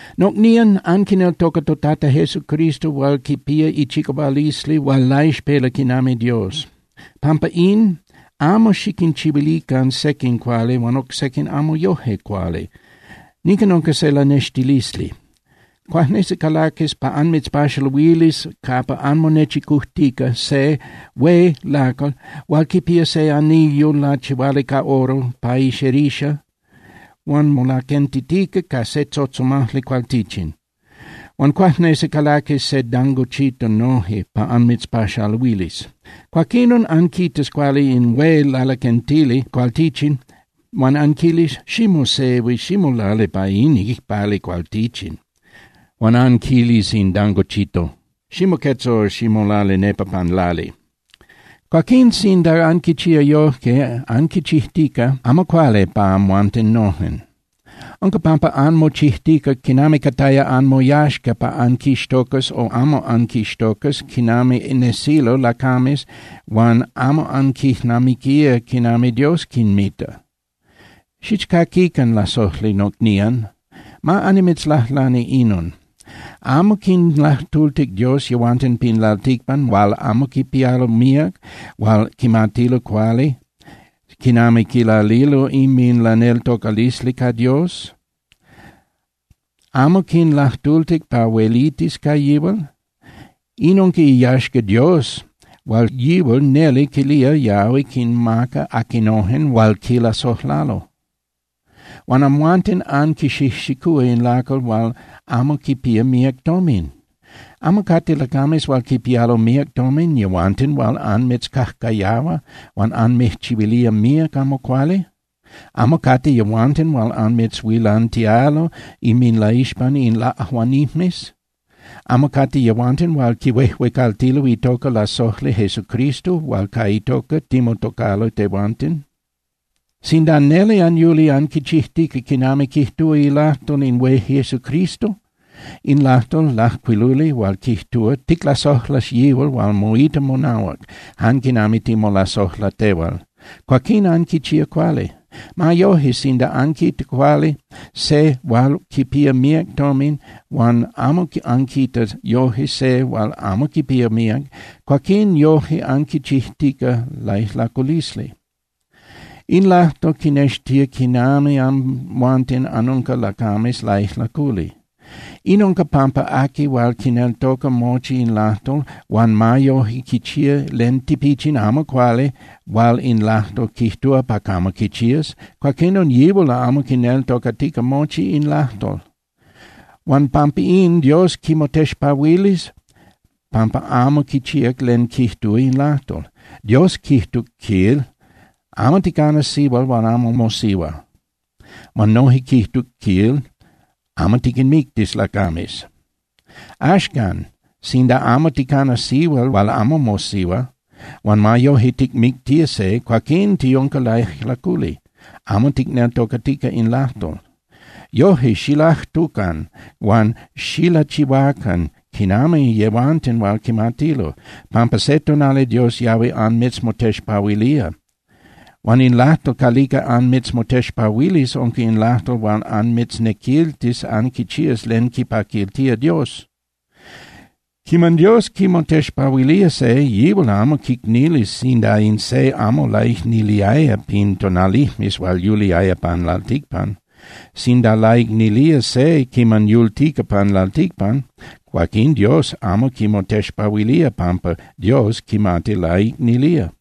Nocnían, anquineltoca toTata Jesucristo hual quipía ichicahualisli hual laixpela quinami Dios. Pampa in, amo xiquinchihuilican sequin cuali huan oc sequin amo yoje cuali. Nican unca se lanextilisli. Cuajnesi calaquis pa anmitzpaxaluilis capa anmonechicujtica se hué lacal hual quipía se anillo lachihuali ca oro pa ixerixa huan molaquentitica ca se tzotzomajli cualtichin. Huan cuajnesi calaquis se dangochito noje pa anmitzpaxaluilis. Cuaquinon, anquitas cuali in hué lalaquentili cualtichin huan anquilis: “Ximosehui, ximolali pa in icpali cualtichin”, huan anquilis in dangochito: “Ximoquetza o ximolali nepa pan lali.” Cuaquín sinda anquichía yojque, anquichijtica amo cuali pa amhuanten nojen. Unca pampa anmochijtica quinami cataya anmoyaxca pa anquixtocas o amo anquixtocas quinami nesilo lacames huan amo anquijnamiquía quinami Dios quinmita. Xichcaquican, lasojli nocnían, ma annimitzlajlani inon: ¿Amo quinlajtultic Dios yehuanten pin lalticpan hual amo quipialo míac hual quimatilo cuali quinami quilalilo inminlaneltocalisli ca Dios? ¿Amo quinlajtultic pa huelitis ca yihual? In unca iyaxca Dios hual yihual neli quilía yahui quinmaca aquinojen hual quilasojlalo. Huan amhuanten anquixijxicúa in lacal hual amo quipía míac tomin. ¿Amo cate lacames hual quipialo míac tomin yehuanten hual anmitzcajcayahua huan anmijchihuilía míac amo cuali? ¿Amo cate yehuanten hual anmitzhuilantialo inminlaixpan in laꞌajuanijmes? ¿Amo cate yehuanten hual quihuejuecaltilo itoca lasojli Jesucristo hual ca itoca timotocalo tehuanten? Sinda neli anyuli anquichijtica quinami quijtúa ilajtol in hué Jesucristo, in lajtol lajcuiluli hual quijtúa: “Ticlasojlas yihual hual moita monahuac jan quinami timolasojla tehual”, cuaquín anquichía cuali. Ma yoje, sinda anquita cuali se hual quipía míac tomin huan amo anquita yoje se hual amo quipía míac, cuaquín yoje anquichijtica laijlaculisli. In lajtol quinextía quinami amhuanten anunca lacames laijlaculi. In unca pampa aqui hual quineltoca mochi in lajtol, huan ma yoje quichía len tipichin amo cuali hual in lajtol quijtúa pa camo quichías, cuaquinon yihual amo quineltocatica mochi in lajtol. Huan pampa in, Dios quimotexpahuilis pampa amo quichíac len quijtúa in lajtol. Dios quijtuc, quil: “Amo ticanas sihual hual amo mosihua.” Huan noje quijtuc, quil: “Amo tiquinmictis lacames.” Axcan, sinda amo ticana sihual hual amo mosihua huan ma yoje ticmictía se, cuaquín tiunca laijlaculi, amo ticneltocatica in lajtol. Yoje, xilajtucan huan xilachihuacan quinami yehuanten hual quimatilo, pampa se tonali Dios yahui anmitzmotexpahuilía. Huan in lajtol calica anmitzmotexpahuilis unca in lajtol hual anmitznequiltis anquichías len quipaquiltía Dios. Quiman Dios quimotexpahuilía se, yihual amo quicnilis sinda in se amo laicniliaya pin tonalijmes hual yuliaya pan lalticpan. Sinda laicnilía se quiman yultica pan lalticpan, cuaquín Dios amo quimotexpahuilía pampa Dios quimati laicnilía.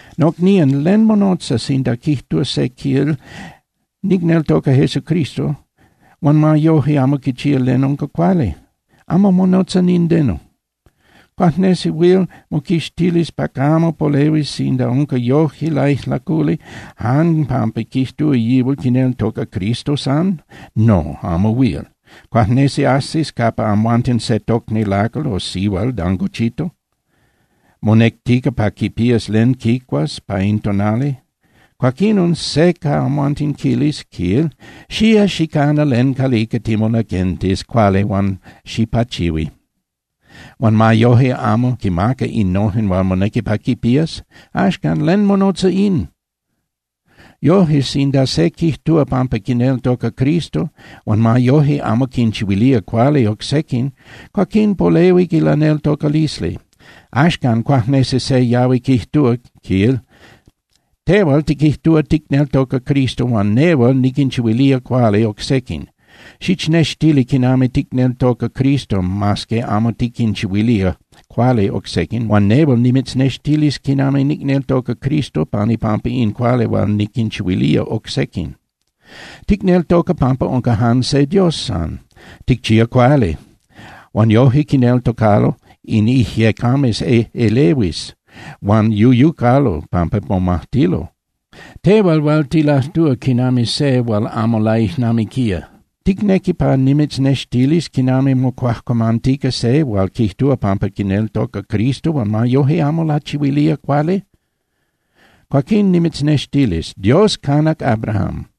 Nocnían, ¿len monotza sinda quijtúa se, quil: “Nicneltoca Jesucristo”, huan ma yoje amo quichía len unca cuali? Amo monotza nindeno. ¿Cuajnesi huil moquixtilis pa camo polehuis sinda unca yoje laijlaculi jan pampa quijtúa yihual quineltoca Cristo san? No, amo huil. Cuajnesi ajsis capa amhuanten se tocni lacal o sihual dangochito, monectica pa quipías len quicuas pa in tonali. Cuaquinon se ca amhuanten quilis, quil: “Xía, xicana len calica timolaquentis cuali huan xipachihui”, huan ma yoje amo quimaca innojen hual monequi pa quipías. Axcan, ¿len monotza in? Yoje, sinda se quijtúa pampa quineltoca Cristo, huan ma yoje, amo quinchihuilía cuali oc sequin, cuaquín polehuic ilaneltocalisli. Axcan cuajnesi se yahui quijtúa, quil: “Tehual tiquijtúa ticneltoca Cristo huan nehual niquinchihuilía cuali oc sequin. Xichnextili quinami ticneltoca Cristo mas que amo tiquinchihuilía cuali oc sequin, huan nehual nimitznextilis quinami nicneltoca Cristo pan ipampa in cuali hual niquinchihuilía oc sequin.” Ticneltoca pampa unca jan se Dios san. Ticchía cuali. Huan yoje quineltocalo in ijyecames ejꞌelehuis huan yuyucalo pampa momajtilo. Tehual hual tilajtúa quinami se hual amo laijnamiquía, ¿ticnequi pa nimitznextilis quinami mocuajcuamantica se hual quijtúa pampa quineltoca Cristo huan ma yoje amo lachihuilía cuali? Cuaquín nimitznextilis. Dios canac Abraham,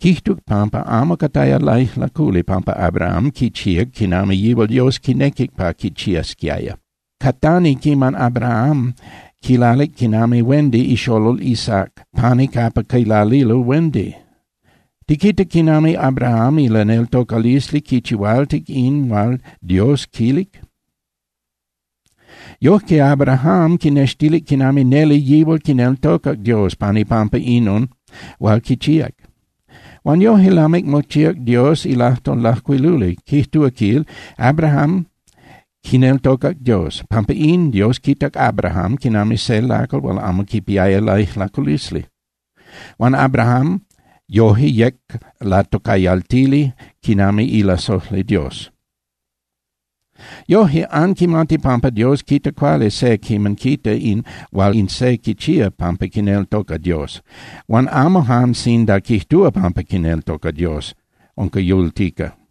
quijtuc pampa amo cataya laijlaculi pampa Abraham quichíac quinami yihual Dios quinequic pa quichiasquiaya. Catani quiman Abraham quilalic quinami huendi ixolol Isaac pani capa quilalilo huendi. Tiquita quinami Abraham ilaneltocalisli quichihualtic in hual Dios quilic. Yoje Abraham quinextilic quinami neli yihual quineltocac Dios pan ipampa inon hual quichíac. Huan yoje lamic mochíac Dios ilajtol lajcuiluli, quijtúa, quil: “Abraham quineltocac Dios. Pampa in, Dios quitac Abraham quinami se lacal hual amo quipiaya laijlaculisli.” Huan Abraham yoje yec latocayaltili quinami ilasojli Dios. Yoje, anquimati pampa Dios quita cuali se quiman quita in hual in se quichía pampa quineltoca Dios, huan amo jan sinda quijtúa pampa quineltoca Dios unca yultica.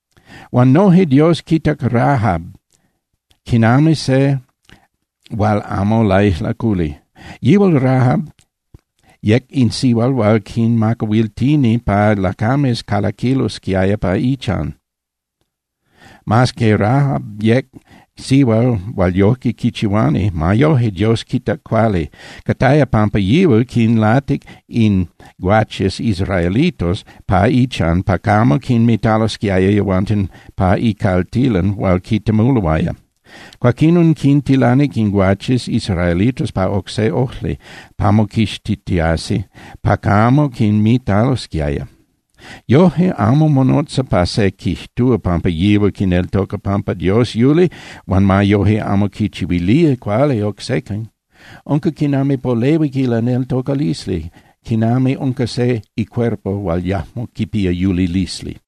Huan noje Dios quitac Rahab quinami se hual amo laijlaculi. Yihual Rahab yec in sihual hual quinmacahuiltini pa lacames calaquilosquiaya pa ichan. Mas que Rahab yec sihual hual yojque quichihuani, ma yoje Dios quitac cuali. Cataya pampa yihual quinlatic in guaches israelitos pa ichan pa camo quinmitalosquiaya yehuanten pa icaltilan hual quintemuloaya. Cuaquinon quintilanic in guaches israelitos pa oc se ojli pa moquixtitiasi pa camo quinmitalosquiaya. Yoje, amo monotza pa se quijtúa pampa yihual quineltoca pampa Dios yuli huan ma yoje amo quinchihuilía cuali oc sequin. Unca quinami polehuic ilaneltocalisli, quinami unca se icuerpo hual yajmo quipía yulilisli.